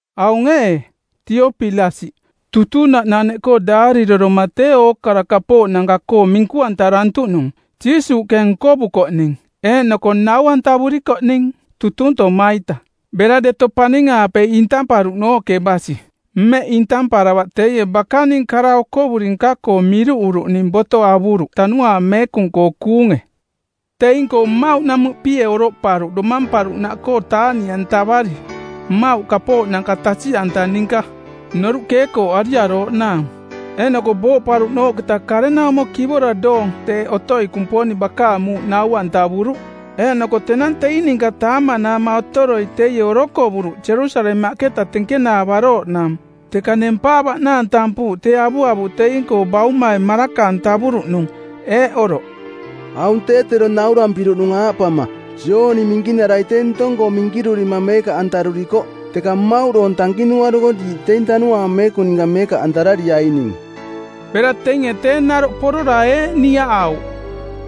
Aung ee, Teopilasiꞌ, Tutunaꞌnaneꞌkoo daarireroma tee ookara kapooꞌnanka-koo minku-antarantuꞌnung Jiisuuꞌke nkovukoꞌning eeꞌnoko nau-antavurikoꞌning tutuntoma-ita bera deto paning-aape intamparuꞌnooꞌke basi. Mmeꞌ intamparavaꞌ teie bakaning kara okovuri nka-koo miruꞌuruꞌning boto avuruꞌ Tanuaang Meekung-koo kuunge. Teing-koo mmauꞌnamuꞌpie oroꞌparuꞌ domamparuꞌnaꞌkoo taaꞌniꞌantavari, mmauꞌ kapooꞌnanka tasiꞌanta ninka, noruꞌ keekooꞌariarooꞌnaang. Eeꞌnoko booꞌparuꞌnooꞌketa karenaumo kivora doong teeꞌ otoi Kumponing bakaang muuꞌ nau-antavuruꞌ. Eeꞌnoko tenang teing ninka taamanaama otoroi teie orokovuruꞌ Jerusalemaꞌketa tenkenaavarooꞌnaang, teka nempaavaꞌnaang tampuuꞌ tee avuavuꞌ teing-koo Baumai maraka-antavuruꞌnung, eeꞌ oroꞌ, “Aung tee tero naurampiruꞌnung aaꞌpama: Jooni Minkinarai tee ntong-koo minkirurima meekaꞌantarurikoꞌ, teka mmauꞌ doong tankinuaruko diiꞌ teing Tanuaang Meekung ninka meekaꞌantarariaining.” Bera teinge tee naroꞌ porora eeꞌ niaꞌauꞌ,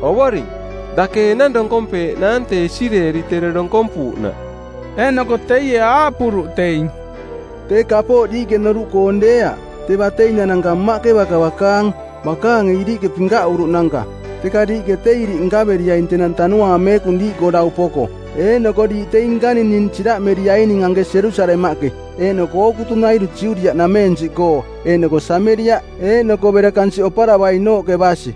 “Ovoring, dake ee enang donkompeeꞌnaang tee Isireeli tero donkompuuꞌnaꞌ?” Eeꞌnoko teie aaꞌpuruꞌ teing, “Tee kapooꞌ diiꞌke noruꞌkoong deeaꞌ; tee bateinananka Mmaꞌke baka bakaang, bakaange iriꞌke pinkaꞌuruꞌnanka. Teka diiꞌke tee iriꞌ nkaveriaing tenang Tanuaang Meekung diiꞌkoo dau poko, eeꞌnoko diiꞌ teing nkaning ning siraꞌmeriaining anke Jerusalemaꞌke, eeꞌnoko ookutunairu Judiaꞌ nameensiꞌkoo eeꞌnoko Sameriaꞌ eeꞌnoko bera kansiꞌ oparavainooꞌke basi.”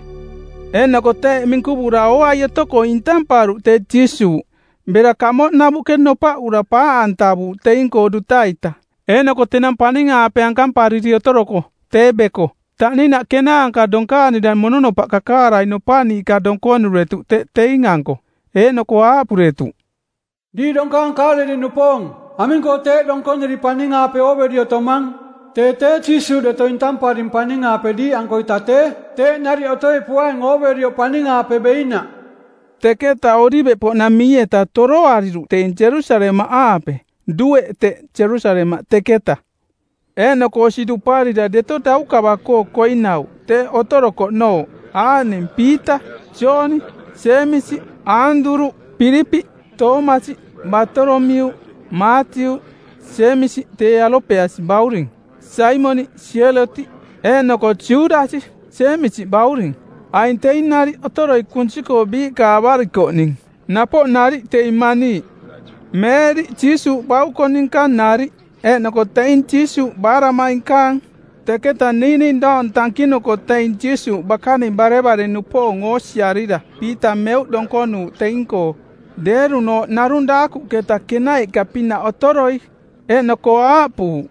Eeꞌnoko teeꞌ minkuvura ooai otoko intamparuꞌ tee Jiisuuꞌ, bera kamoꞌnavuꞌke nopaꞌura paaꞌantavuuꞌ teing-koo duta-ita. Eeꞌnoko tenang paning-aape ankampariri otoroko, tee beko, taꞌninaꞌ kenaanka donkaanira mononopaꞌ kakaarai nopaꞌniiꞌka donkonuretuꞌ teꞌ teing-anko. Eeꞌnoko aaꞌpuretuꞌ, “Diiꞌ donkaang Kaaleliꞌnupoong, aming-koo teeꞌ donkoniri paning-aape ooveri otomang? Tee tee Jiisuuꞌ deto intamparing paning-aape diiꞌankoita tee, teeꞌ nariꞌ otoi poaing ooverioꞌ paning-aape beinaꞌ.” Teketa Oliveꞌpoꞌnamii-eta toroariruꞌ teing Jerusalemaꞌaape. Dueꞌ teꞌ Jerusalemaꞌ teketa. Eeꞌnoko osi duparira deto daukava-koo koinauꞌ teꞌ otorokoꞌnooꞌ aaꞌning: Piita, Jooni, Jeemisi, Aanduruꞌ, Pilipiꞌ, Toomasi, Baatolomiuꞌ, Maatiuꞌ, Jeemisi tee Alopeasi bauring, Saimoniꞌ Sielotiꞌ, eeꞌnoko Judasi Jeemisi bauring. Aing teing nariꞌ otoroi kunsi-koo biiꞌka avarikoꞌning, napoꞌ nariꞌ teing maniiꞌ, Meeriꞌ Jiisuuꞌ bauko ninka nariꞌ, eeꞌnoko teing Jiisuuꞌ baaraꞌmainkaang. Teketa niiꞌning doong tankinuko teing Jiisuuꞌ bakaning barevare-nupoong oosiarira Piita meuꞌ donkonuuꞌ teing-koo, deerunooꞌ narung daakuꞌketa kenaiꞌka-pinaꞌ otoroi. Eeꞌnoko aaꞌpuuꞌ,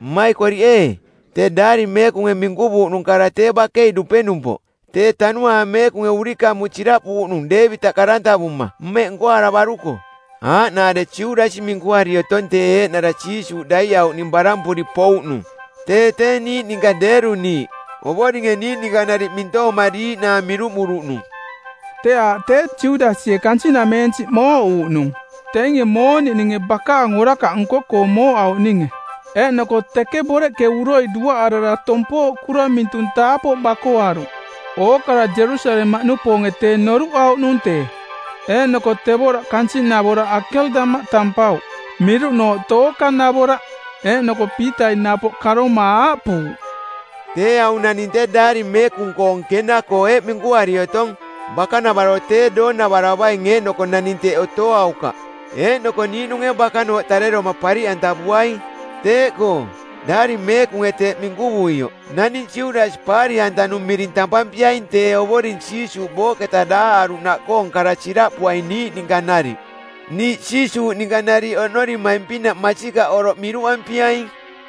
“Mmaikoriꞌ ee, tee Daari Meekunge minkuvuuꞌnung kara tee bakei dupenumpoꞌ tee Tanuaang Meekunge urikamuꞌ siraꞌpuuꞌnung Deevitaꞌ karantavuma˜ mmeꞌ nkoaravaruko, aaꞌnaare Judasi minkuari otong tee eeꞌnara Jiisuuꞌ daiꞌauꞌning barampuri pouꞌnung. Tee tee niiꞌ ninka deeruniiꞌ, Ovoringe niiꞌ ninka nariꞌ mintoomariiꞌnaang miruꞌmuruꞌnung.” Tee aaꞌ tee Judasie kansiꞌnameensiꞌ mooꞌuuꞌnung teinge mooniꞌninge bakaang orakaꞌ nko-koo mooꞌauꞌninge, eeꞌnoko teke boreꞌke uroi duaꞌarara tompooꞌkura mintung taapoꞌ bakoaruꞌ. Ookara Jerusalemaꞌnupoonge tee noruꞌauꞌnung tee, eeꞌnoko tevoraꞌ kansiꞌnavoraꞌ Akeldama tampauꞌ, miruꞌnooꞌ Tookanavoraꞌ. Eeꞌnoko Piitai napoꞌ karoma aaꞌpuuꞌ, “Tee aung naning tee Daari Meekung-koong Kena-koo eeꞌ minkuari otong, ‘Bakanavaro tee doonavaravaing eeꞌnoko naning teꞌ otoaukaꞌ.’ Eeꞌnoko ‘Niiꞌnunge bakanooꞌ tareroma pariꞌantavuaing.’ Teeꞌkoo, Daari Meekunge teeꞌ minkuvuioꞌ naning Judasi paari-antanung miring tampampiaing tee Ovoring Jiisuuꞌ booꞌketa daaꞌaruꞌnaꞌkoong kara siraꞌpuaing niiꞌ ninka nariꞌ. Niiꞌ Jiisuuꞌ ninka nariꞌ oꞌnorimaing-pinaꞌ masikaꞌ oroꞌ miruꞌampiaing.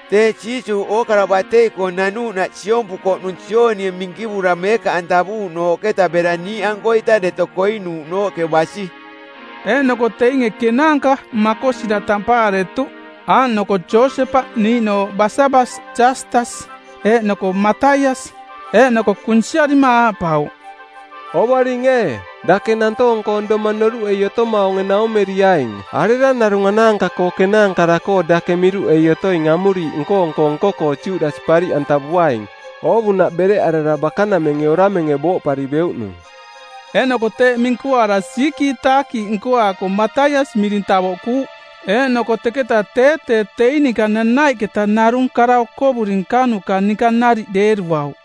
Tee Jiisuuꞌ ookara batei-koo nanuuꞌnaꞌ siompukoꞌnung Joonie minkivura meekaꞌantavuuꞌnooꞌketa bera niiꞌankoita deto koinuuꞌnooꞌke basi.” Eeꞌnoko teinge kenaanka makosira tampaaretuꞌ aaꞌnoko Josepaꞌ, niiꞌnooꞌ Basabas Jaastas eeꞌnoko Mataias. Eeꞌnoko kunsiarima aaꞌpauꞌ, “Ovoring ee, dake nantoong-koong domang noruꞌei otomaunge naumeriaing arera narung anaanka-koo kenaankara-koo dake miruꞌei otoing amuriiꞌ nko-nko nko-koo Judasi pariꞌantavuaing, oovunaꞌ bereꞌarara bakanamenge oramenge booꞌpari beuꞌnung.” Eeꞌnoko teeꞌ minkuaara siikiitaakiiꞌ nkoaako Mataias miring tavoꞌkuuꞌ. Eeꞌnoko teketa tee tee teing ninka nanaiꞌketa narung kara okovuri nkanuka ninka nariꞌ deeruauꞌ.